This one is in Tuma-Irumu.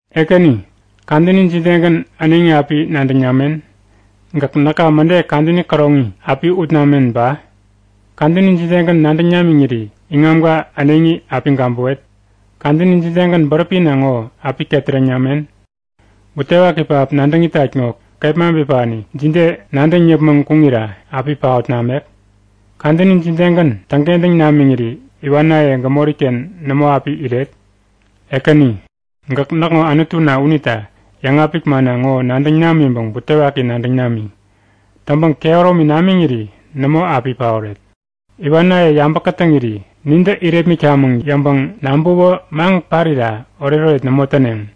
Ekäni, kadäni jidegän äneŋi api nadäŋ namen? Gäk näka mäde kadäni käroŋi api ut namen ba? Kadäni jidegän nadäŋ namiŋiri iŋamka äneŋi api gabäwet? Kadäni jidegän bäräpina ŋo api ketäreŋ namen? Butewaki pähap nadäŋ itat ŋo kepma bipani jide nadäŋ yäpmäŋ kuŋira api paot namek? Kadäni jidegän täŋkentäŋ namiŋiri iwanaye gämoriken nämo api iret? Ekäni, gäk näkŋo Anutuna unita yäŋapik manna ŋo nadäŋ namiŋpäŋ butewaki nadäŋ nami. Täŋpäŋ kehäromi namiŋiri nämo api paoret. Iwanaye yabä kätäŋiri nintä irepmitkamäŋ yäŋpäŋ nabäwä maŋ parira oretoret nämo täneŋ.